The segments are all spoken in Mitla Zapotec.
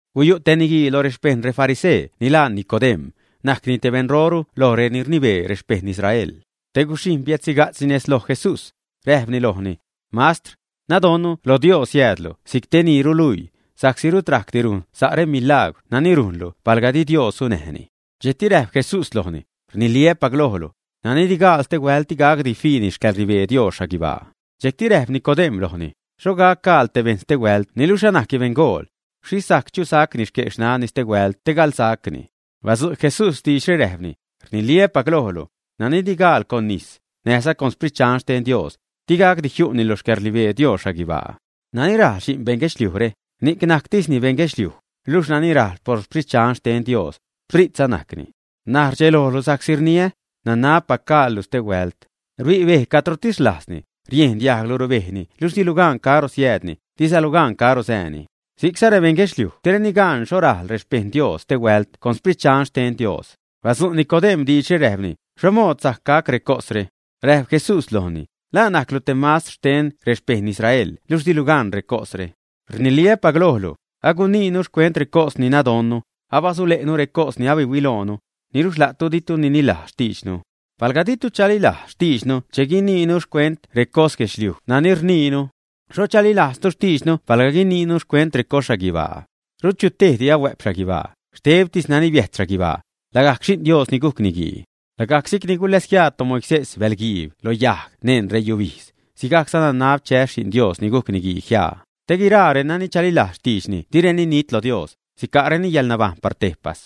Guyu' te niguii lo rexpejṉ refarisee ni laa Nicodem̲, najcni te beṉroru loj reni rnibee rexpejṉ Israel. Te guxhijṉ biädxhiga'tzni nez loj Jesús, räjpni lojni: ―Mastr, nadonnu lo Dios siäädlu si'c te ni ruluii, sa'csi rut rajcdi rujn sa' remilagwr nani rujnlu palga di Dios sunäjni. Dxejcti räjp Jesús lojni: ―Rniliä́pac lojlu, nani di gaal stehuält, di gacdi fiini xcäḻrnibee Dios xhaguibaa. Dxejcti räjp Nicodem̲ lojni: ―¿Xho gac gaal te bejṉ stehuält niluxh anajcni beṉgool? ¿Xhixh sajc chusacni xque' xnanni stehuält te galsacni, ä? Badzu' Jesús diidxre räjpni: ―Rniliä́pac lojlu, nani di gaal con nis, näjza con Sprit Dxan xten Dios, di gacdi jiu'ni lo xcäḻrnibee Dios xhaguibaa. Nani rajl xi'n beṉ guedxliujre, ni'c najctisni bejṉ guedxliuj, luxh nani rajl por Sprit Dxan xten Dios, Spritza najcni. Na'c rdxelojlu sa'csi rniä: “Nanabpac gaallu stehuält.” Rbi' bej cadrotis rlajzni; riejn diajglu rubejni niluxh dilu gan caro siäädni, dizalu gan caro sääni. Si'cza rebejṉ guedxliuj direni gan xho rajl rexpejṉ Dios stehuält con Sprit Dxan xten Dios. Badzu' Nicodem̲ diidxre, räjpni: ―¿Xho mood sajc gac recosre? Räjp Jesús lojni: ―¿La najclu te mastr xten rexpejṉ Israel luxh dilu gan recosre, ä? Rniliä́pac lojlu, aguniinu xcuent recos ni nadonnu, abasule'nu recos ni abahuiloonu, niluxh la'tu ditu nililajz xtiidxnu. Palga ditu chalilajz xtiidxnu che guniinu xcuent recos guedxliuj nani rniinu: ¿Xho chalilajztu xtiidxnu palga guiniinu xcuent recos xhaguibaa? ’Rut chutejdi ahuä'p xhaguibaa, xtebtis nani biäjt xhaguibaa, lagajc Xi'n Dios ni gujc Niguii. Lagajc si'cni guläsjiaa toMoisés bäḻ guiib lo yajg neṉ reyubijdz, sigajcza nanab chäs Xi'n Dios ni gujc Niguii jiaa; te guiraa renani chalilajz xtiidxni direni nit lo Dios, sica'reni yäḻnabajṉ par tejpas.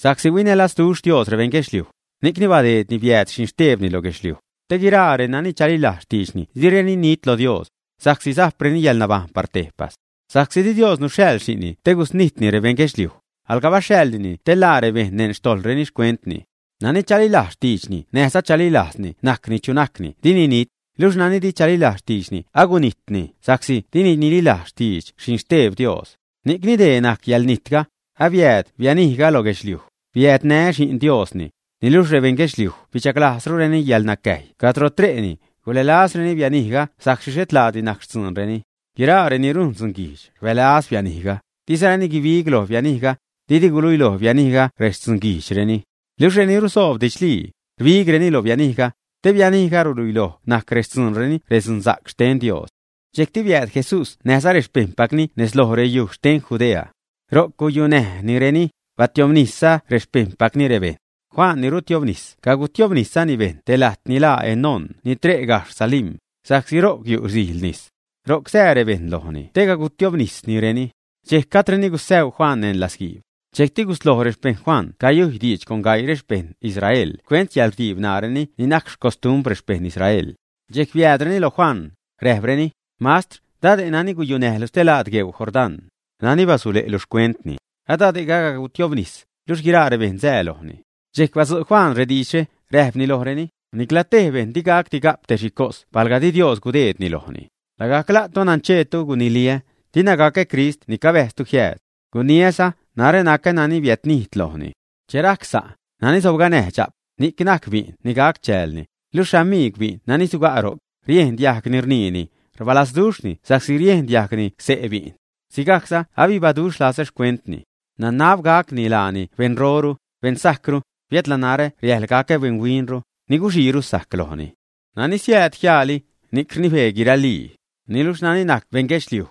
’Sa'csi huinälazduxh Dios rebejṉ guedxliuj, ni'cni badeedni biääd Xinxtebni lo guedxliuj, te guiraa renani chalilajz xtiidxni direni nit lo Dios, sa'csi sajpreni yäḻnabajṉ par tejpas. Sa'csi di Dios nuxhaḻ xi'nni te gusnijtni rebejṉ guedxliuj, alga baxhaḻnini te ḻaa rebejṉ neṉ xtojḻreni xcuentni. ’Nani chalilajz xtiidxni näjza chalilajz najcni chu najni najcni dini nit, luxh nani di chalilajz xtiidxni agunijtni sa'csi dini nililajz xtidx Xinxteb Dios. Ni'cni dee najc yäḻnijtga: abiääd bianijga loj guedxliuj, biädnä Xi'n Diosni, niluxh rebejṉ guedxliuj bidxaglajzrureni yäḻnacäjy cadro tre'reni, gulälazreni bianijga sa'csi xhet laadi najc xtzuunreni. Guiraa reni rujn dzunguijdx, rbälaz bianijga, dizareni guibig loj bianijga, didi guluiloj bianijga rextzunguijdxreni. Luxh reni rusoob didxlii, rbigreni loj bianijga, te bianijga ruluiloj najc rextzuunreni redzunsa'c xten Dios. Dxejcti biääd Jesús näjza rexpejṉpacni nez lo reyuj xten Judea. Ro'c guyunäjnireni, batiobnisza rexpejṉpacni rebejṉ. Juan ni Rutiobnis cagutiobniszani bejṉ te lajt ni laa Enón ni tre' gajxh Salim, sa'csi ro'c yu' sijl nis. Ro'c sää rebejṉ lojni te cagutiobnisnireni. Dxejc gajdreni gusäu Juan neṉ latzguiib. Dxejcti gusloj rexpejṉ Juan cayujy diidx con gaii xpejṉ Israel xcuent yäḻrdiib ṉaareni ni najc xcostumbr rexpejṉ Israel. Dxejc biäädreni lo Juan, räjpreni: ―Mastr, dade' nani guyunäjlu stelaad gueu Jordán, nani basule'lu xcuentni, adade'ga cagutiobnis, luxh guiraa rebejṉ asää lojni. Dxejc badzu' Juan diidxre, räjpni lojreni: ―Nicla tej bejṉ digacdi ga'p te xhi cos palga di Dios gudeedni lojni. Lagajc la'tu nancheetu guniliä: “Dina gacä Crist ni cabäjztu jiääd.” Guniäza: “Narä nacä nani biädnijd lojni.” Che rajc sa', nani sobganäj dxa'p, ni'c najc bi'n ni gac chäälni, luxh xamigw bi'n nani suga' ro'c, riejn diajgni rniini, rbalazduxhni sa'csi riejn diajgni xse' bi'n. Sigajcza abibaduxh lazä xcuentni. Nanab gacni laani beṉroru, beṉsajcru, biädla narä riajḻ gacä beṉhuinru, ni guxiiru sajc lojni. ’Nani siääd jiaali, ni'c rnibee guiralii, niluxh nani najc beṉ guedxliuj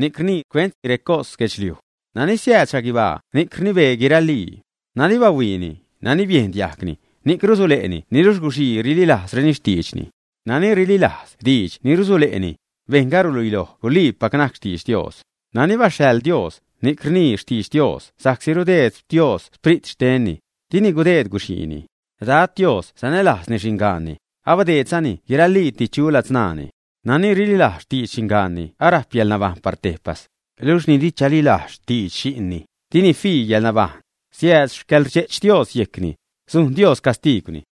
ni'c rnii xcuent recos guedxliuj. Nani siääd xhaguibaa ni'c rnibee guiralii. Nani bahuiini, nani biejn diajgni, ni'c rusule'ni niluxh guxii rililajzreni xtiidxni. Nani rililajz diidx ni rusule'ni, bejṉga ruluiloj guliipac najc xtidx Dios. Nani baxhaḻ Dios, ni'c rnii xtidx Dios sa'csi che rudeed Dios Sprit xtenni, dini gudeed guxiini. Dad Dios sanälajzni xingaanni, abadeedzani guiraliiti chu ladzṉaani. Nani rililajz xtidx xingaanni arajp yäḻnabajṉ par tejpas, luxh ni di chalilajz xtidx xi'nni, dini fii yäḻnabajṉ, siääd xcäḻrdxe'ch Dios yejcni, sujn Dios castiigwni.